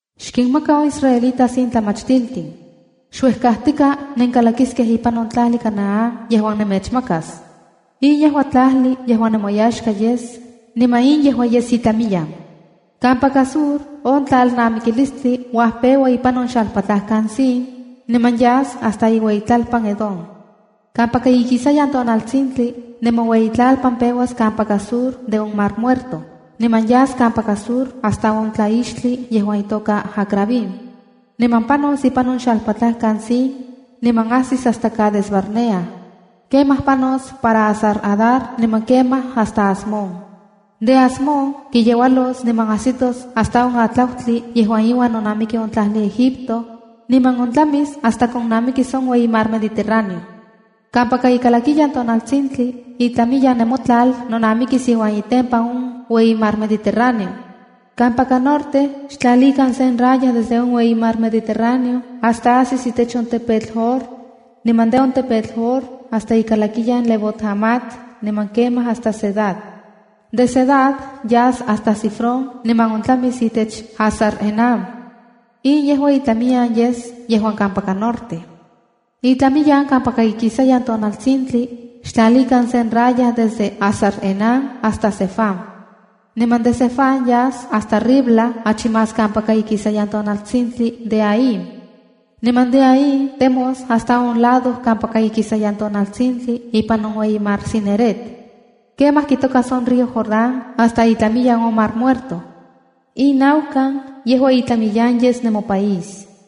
“Xkinmaka on israelitas in tlamachtiltin: Xuejkajtika nenkalakiskej ipan on tlajli Canaán yejuan nemechmakas. In yejua tlajli yejuan nemoyaxka yes, niman in yejua yes itlamiyan: ’Kampaka Sur, on tlalnamikilistli uajpeua ipan on xalpatlajkan Zin, niman yas hasta iueyitlalpan Edom. Kampaka ikisayan tonaltsintli, nemoueyitlalpan peuas kampaka Sur de on Mar Muerto, niman yas kampaka sur hasta on tlaixtli yejuan itoka Acrabim. Niman panos ipan on xalpatlajkan Zin niman ajsis hasta Cades Barnea. Kemaj panos para Hasar-adar niman kemaj hasta Asmón. De Asmón kiyeualos niman ajsitos hasta on atlautli yejuan iuan nonamiki on tlajli Egipto, niman ontlamis hasta konnamikis on Ueyi Mar Mediterráneo. ’Kampaka ikalakiyan tonaltsintli, itlamiyan nemotlal nonamikis iuan itempan on Ueyi Mar Mediterráneo. ’Kampaka norte, xtlalikan sen raya desde on Ueyi Mar Mediterráneo hasta ajsis itech on tepetl Hor, niman de on tepetl Hor hasta ikalakiyan Lebó-hamat, niman kemaj hasta Zedad. De Zedad, yas hasta Zifrón niman ontlamis itech Hazar-enán. In yejua itlamiyan yes yejuan kampaka norte. ’Itlamiyan kampaka ikisayan tonaltsintli, xtlalikan sen raya desde Hazar-enán hasta Sefam. Niman de Sefam yas hasta Ribla achi más kampaka ikisayan tonaltsintli de Aín. Niman de Aín temos hasta on lado kampaka ikisayan tonaltsintli ipan on Ueyi Mar Cineret. Kemaj kitokas on río Jordán hasta itlamiyan on Mar Muerto. “In naukan yejua itlamiyan yes nemopaís.”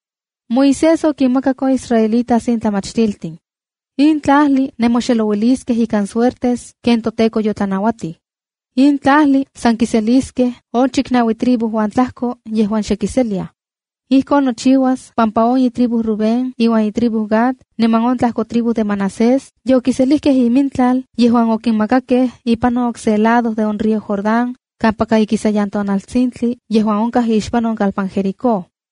Moisés okinmakak on israelitas in tlamachtiltin: “In tlajli nemoxelouiliskej ikan suertes ken toTEKO yotlanauatij. In tlajli san kiseliskej on chiknaui tribu uan tlajko yejuan xe kiseliaj. Ijkon nochiuas pampa on itribu Rubén iuan itribu Gad niman on tlajko tribu de Manasés yokiselijkej imintlal yejuan okinmakakej, ipan on okse lado de on río Jordán, kampaka ikisayan tonaltsintli yejuan onkaj ixpan on kalpan Jericó.”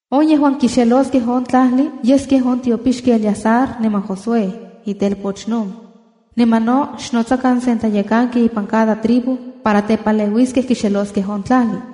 “On yejuan kixeloskej on tlajli yeskej on tiopixki Eleazar niman Josué, itelpoch Nun. Niman no xnotsakan sen tlayekanki ipan cada tribu, para tepaleuiskej kixeloskej on tlajli.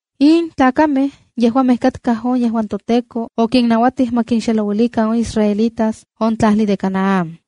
In tlakamej yejuamej katkaj on yejuan toTEKO okinnanuatij ma kinxelouilikan on israelitas on tlajli de Canaán.